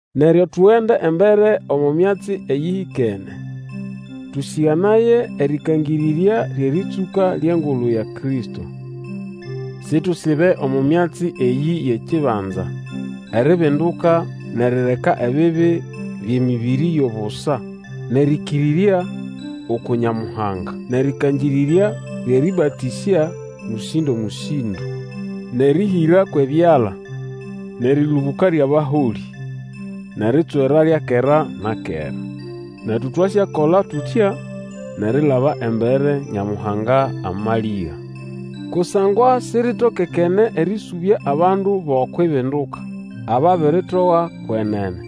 Neryo tugende embere omo myatsi eyĩhĩkene, tũsĩganaye erĩkangĩrĩrya lyʼerĩtsũka lyʼengulu ya Kristo. Situsibe omo myatsi eyĩ yʼekibanza: eribinduka nʼerireka ebibi byʼemĩbĩrĩ yʼobusa, nʼerĩkĩrĩrya uku Nyamuhanga, nʼerĩkangĩrĩrya lyʼerĩbatĩsya mũsĩndo-mũsĩndo, nʼeryʼerĩhĩra kwʼebyala, nʼerĩlũbũka lyʼabaholĩ, nʼeritswera lya kera na kera. Netu twasyakola tutya, nʼerilaba embere, Nyamuhanga amalĩga. Kusangwa siritokekene erĩsũbya abandu bʼokwʼibinduka, ababiritoga kwenene.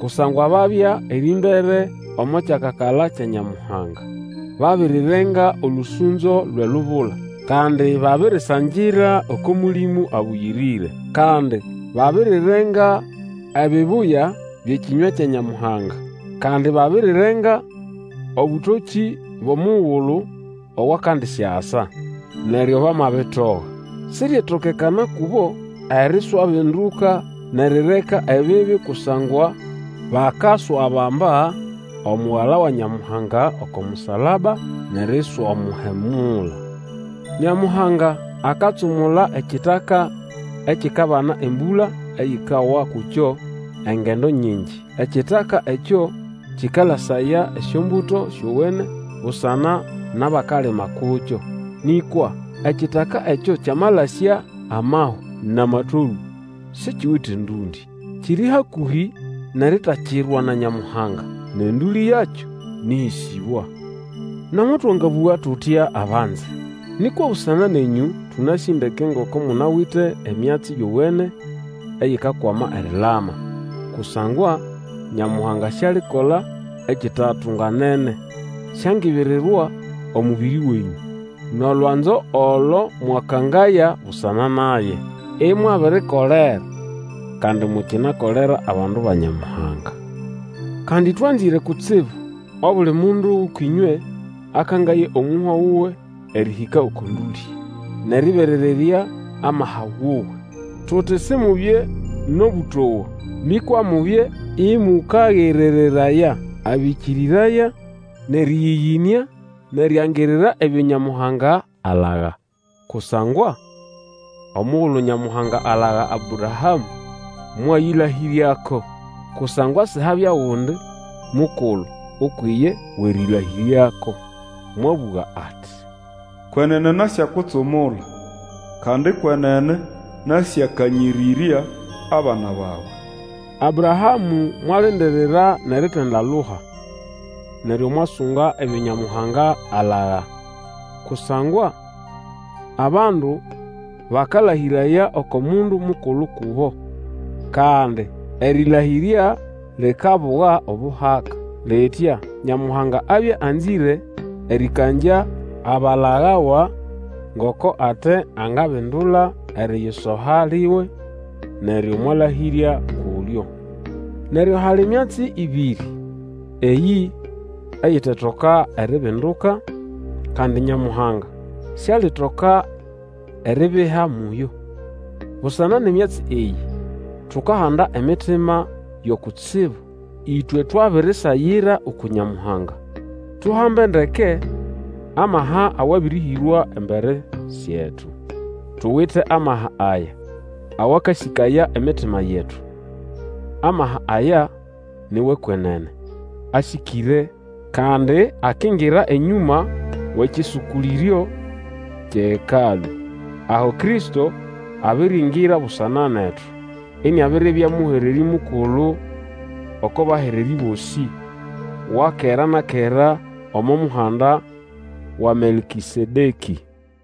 Kusangwa babya erĩmbere omo kyakakala kya Nyamuhanga. Babirirenga olũsũnzo lwʼelubula, kandi babirisangira oko Mũlĩmũ Abũyĩrĩre. Kandi babirirenga ebibuya byʼekĩnywa kya Nyamuhanga, kandi babirirenga obũtokĩ bwʼomugulu owakandisyasa. Neryo bamabitoga, siryetokekana kubo eriswabinduka nʼerireka ebibi kusangwa bakaswabamba Omugala wa Nyamuhanga oko musalaba, nʼeriswamuhemula. Nyamuhanga akatsumula ekitaka ekikabana embũla eyikawa kukyo engendo nyingi, ekitaka ekyo kĩkalasaya esyombuto syowene busana nʼabakalima kukyo. Nĩkwa ekitaka ekyo kyamalasya amahwa nʼamatolũ, sikiwite ndũndĩ. Kiri hakũhĩ nʼeritakirwa na Nyamuhanga, nʼendũlĩ yakyo nĩʼhĩsĩbwa. Nomo twangabũga tutya, abanze, nĩkwa busana nenyũ, tũnasĩ ndeke ngoko munawite emyatsi yowene eyikakwama erilama. Kusangwa Nyamuhanga sialikola ekitatunganene. Siangibirirwa omũbĩrĩ wenyũ, nʼolwanzo olo mwakangaya busana naye, imwabirikolera, kandi mukinakolera abandu ba Nyamuhanga. Kandi twanzĩre kutsibu obuli mundu gʼũkwʼĩnywe akangaye omũhwa wuwe erĩhĩka oko ndũlĩ, nʼerĩberererya amaha wuwe. Tuti Simubye nʼobũtowa nĩkwa mubye mũkagerereraya abĩkĩrĩraya nʼerĩyĩyĩnĩa nʼeriangirira ebyo Nyamuhanga alaga. Kusangwa omugulu Nyamuhanga alaga Abrahamũ, mwayĩlahĩryako, kusangwa sihabya ogundi mukulu ukwʼiye wʼerĩlahĩryako. Mwabũga ati, Kwenene nasyakutsumula, kandi kwenene nasyakanyĩrĩrya abana bawe. Abrahamũ mwalindirira nʼeritindaluha, neryo mwasunga ebyo Nyamuhanga alaga. Kusangwa abandu bakalahĩraya oko mundu mukulu kubo, kandi erĩlahĩrya likabuga obuhaka. Litya Nyamuhanga abya anzĩre erĩkangya abalagawa ngoko ate angabindula eriyisoha liwe, neryo mwalahĩrya kulyo. Neryo hali myatsi ĩbĩrĩ eyĩ eyitetoka eribinduka, kandi Nyamuhanga sialitoka eribiha muyo. Busana nʼemyatsi eyĩ, tukahanda emitima yo kutsibu, ĩtwe twabirisagira uku Nyamuhanga, tuhambe ndeke amaha awabĩrĩhĩrwa embere syetu. Tuwite amaha aya awakasĩkaya emitima yetu. Amaha aya ni wʼekwenene, asĩkĩre, kandi akingira enyũma wʼekĩsũkũlĩryo kyʼeHekalũ, aho Kristo abiriingira busana netu, iniabiribya mũhererĩ mukulu oko bahererĩ bosĩ, wa kera na kera omo muhanda wa Melkĩsedekĩ.